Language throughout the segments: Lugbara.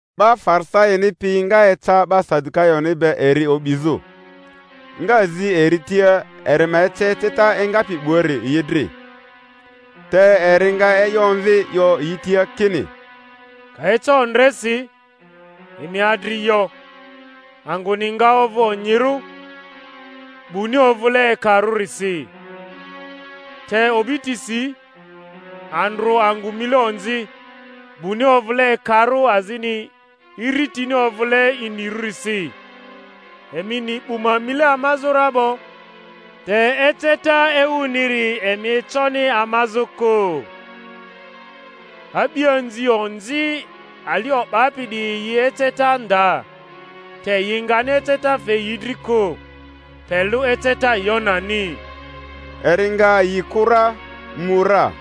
'Ba Farisaini piyi nga eca 'ba Sadukayoni be eri o'bizᴜ, nga zi eri tia eri ma ece eceta engapi 'buari yi dri. Te eri nga e'yo omvi, 'yo yi tia kini, Ka eca ondresi, emi adri 'yo, Angᴜni nga ovᴜ onyirᴜ, 'buni ovᴜle ekarᴜrisi. Te o'bitisi, Andrᴜ angᴜ mile onzi, 'buni ovᴜle ekarᴜ azini iritini ovᴜle inirᴜrisi. Emi ni 'bu ma mile amazᴜ ra 'bo, te eceta ewuniri emi econi amazᴜ kᴜ. A'bianzi onzi ali o'bapi 'diyi yi eceta nda, te yi ngani eceta fe yi dri kᴜ, pe lᴜ eceta Yonani. Eri nga yi kᴜ ra, mu ra.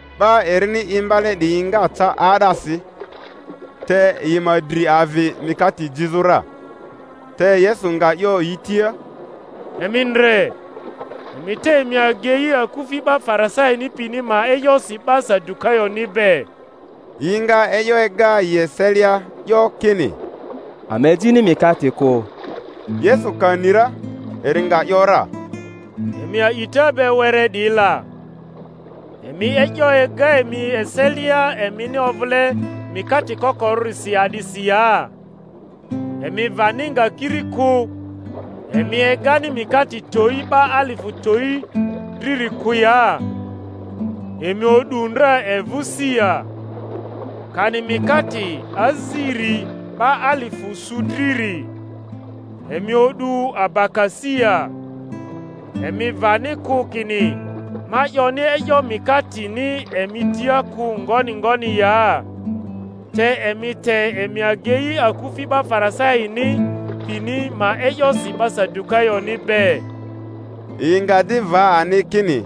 'Ba erini imbale 'diyi nga ca 'aa'dasi, te yi ma dri avi mikate jizᴜ ra. Te Yesu nga 'yo yi tia, Emi ndre emi te emi agei akufi 'ba Farisaini pini ma e'yosi 'ba Sadukayonibe. Yinga e'yo ega yieselia, 'yo kini, Ama ejini mikate kᴜ. Yesu ka ni ra eri nga ‘yora, Emi a'ita be were 'diyi la, emi e'yo ega emi eselia emini ovᴜle mikate kokorᴜrisi a'disi ya? Emi vani nga kiri kᴜ, emi egani mikate towi 'ba alifᴜ towi driri kᴜ ya? Emi o'du ndra evᴜ si ya? Kani mikate aziri 'ba alifᴜ su driri, emi o'du abaka si ya? Emi vani kᴜ kini ma 'yoni e'yo mikateni emi tia kᴜ ngoni ngoni ya? Te emi te emi agei akufi 'ba Farisaini pini ma e'yosi 'ba Sadukayoni be. Yi nga di va ani kini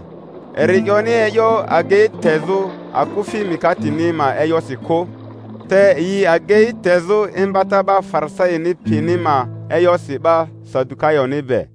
eri 'yoni e'yo agei tezᴜ akufi mikateni ma e'yosi kᴜ, te yi agei tezᴜ imbata 'ba Farisaini pini ma e'yosi 'ba Sadukayoni be.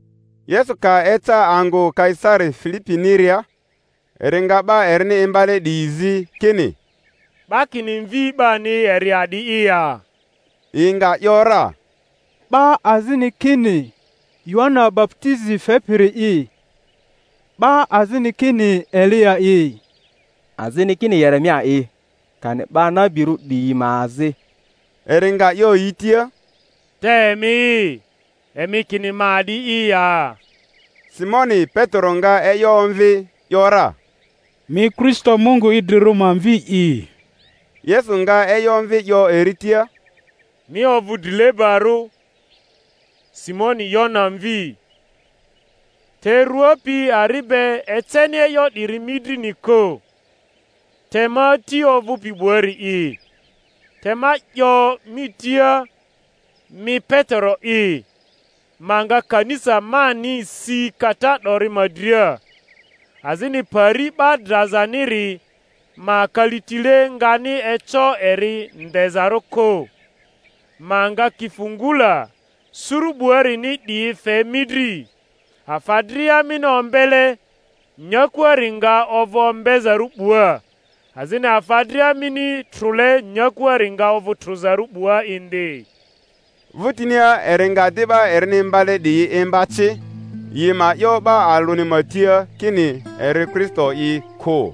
Yesu ka eca angᴜ Kaisari Filipiniria, eri nga 'ba erini imbale 'diyi zi kini, 'Ba kini Mvi 'bani eri a'di'i ya? Yi nga ‘yora, 'Ba azini kini Yohana baputizi fepiri'i, 'ba azini kini Eliya'i, azini kini Yeremia'i kani 'ba nabirᴜ 'diyi ma azi. Eri nga 'yo yi tia, Te emi'i, emi kini ma a'di'i ya? Simoni Petero nga e'yo omvi, ‘yora, Mi Kristo Mungu idrirᴜri ma Mvi'i. Yesu nga e'yo omvi 'yo eri tia, Mi ovᴜ drilebarᴜ, Simoni Yona mvi! Te rua pi ari be eceni e'yo 'diri mi drini kᴜ, te ma Ati ovᴜpi 'buari'i. Te ma 'yo mi tia, mi Petero'i, ma nga kanisa mani si kata 'dori ma dria, azini Pari 'ba drazaniri ma kalitile ngani eco eri ndezarᴜ kᴜ. Ma nga kifungula suru 'buarini 'diyi fe mi dri, afa dria mini ombele. nyakuari nga ovᴜ ombezarᴜ 'bua, azini afa dria mini trᴜle nyakuari nga ovᴜ trᴜzarᴜ 'bua indi. Vᴜtinia eri nga di 'ba erini imbale 'diyi imba ci yi ma 'yo 'ba alᴜni ma tia kini eri Kristo'i kᴜ.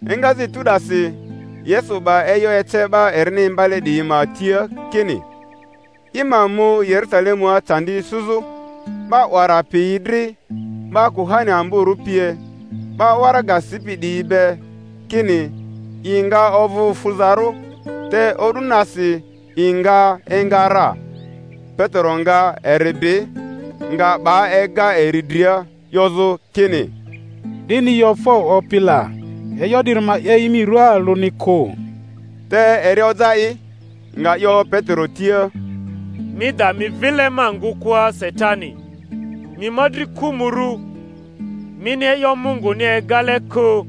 Engazᴜ etu 'dasi Yesu 'ba e'yo ece 'ba erini imbale 'diyi ma tia kini i ma mu Yerusalemua candi isuzᴜ 'ba 'wara piyi dri 'ba kuhani amborᴜ pie, 'ba waraga sipi 'diyi be, kini i nga ovᴜ fuzarᴜ, te o'du nasi i nga enga ra. Petero nga eri bi, nga 'ba ega eri dria 'yozᴜ kini, 'Dini yo fo, Opi la! E'yo 'diri ma 'ye i mi ruaa alᴜni kᴜ. Te eri oja i, nga 'yo Petero tia, Mi da mi vile ma ngᴜkᴜa, Satani! Mi ma dri kᴜmᴜrᴜ, mini e'yo Munguni egale kᴜ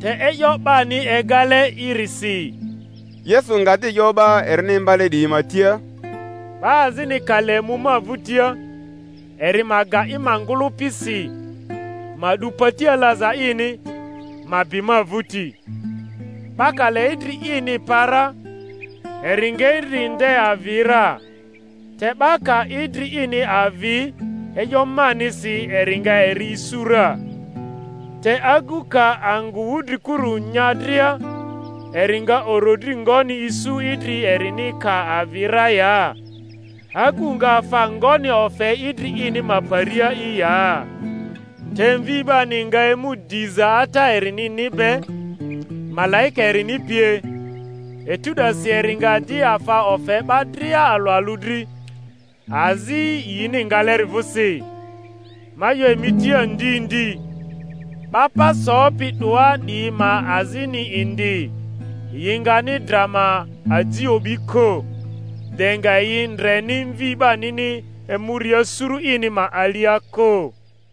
te e'yo 'bani egale'irisi. Yesu nga di 'yo 'ba erini imbale 'diyi ma tia, Ba azini ka le mu ma vᴜtia, eri ma ga i ma ngᴜlᴜpi si, ma 'du pati alaza ini, ma bi ma vᴜti. 'Ba ka le idri ini pa ra eri nga idri nde avi ra, te 'ba ka idri ini avi e'yo manisi eri nga eri isu ra. Te agu ka angᴜ wudrikuru nya dria, eri nga orodri ngoni isu idri erini ka avi ra ya? Agu nga afa ngoni ofe idri ini ma paria'i ya? Te Mvi 'bani nga emu diza Ata erinini be, malaika erini pie; etu 'dasi eri nga di afa ofe 'ba dria alᴜ alᴜ dri, azi yini ngaleri vᴜsi. Ma 'yo emi tia ndi ndi, 'ba pa sopi 'doa 'diyi ma azini indi, yi ngani dra ma aji o'bi kᴜ, de nga yi ndreni Mvi 'banini emuria suru ini ma alia kᴜ.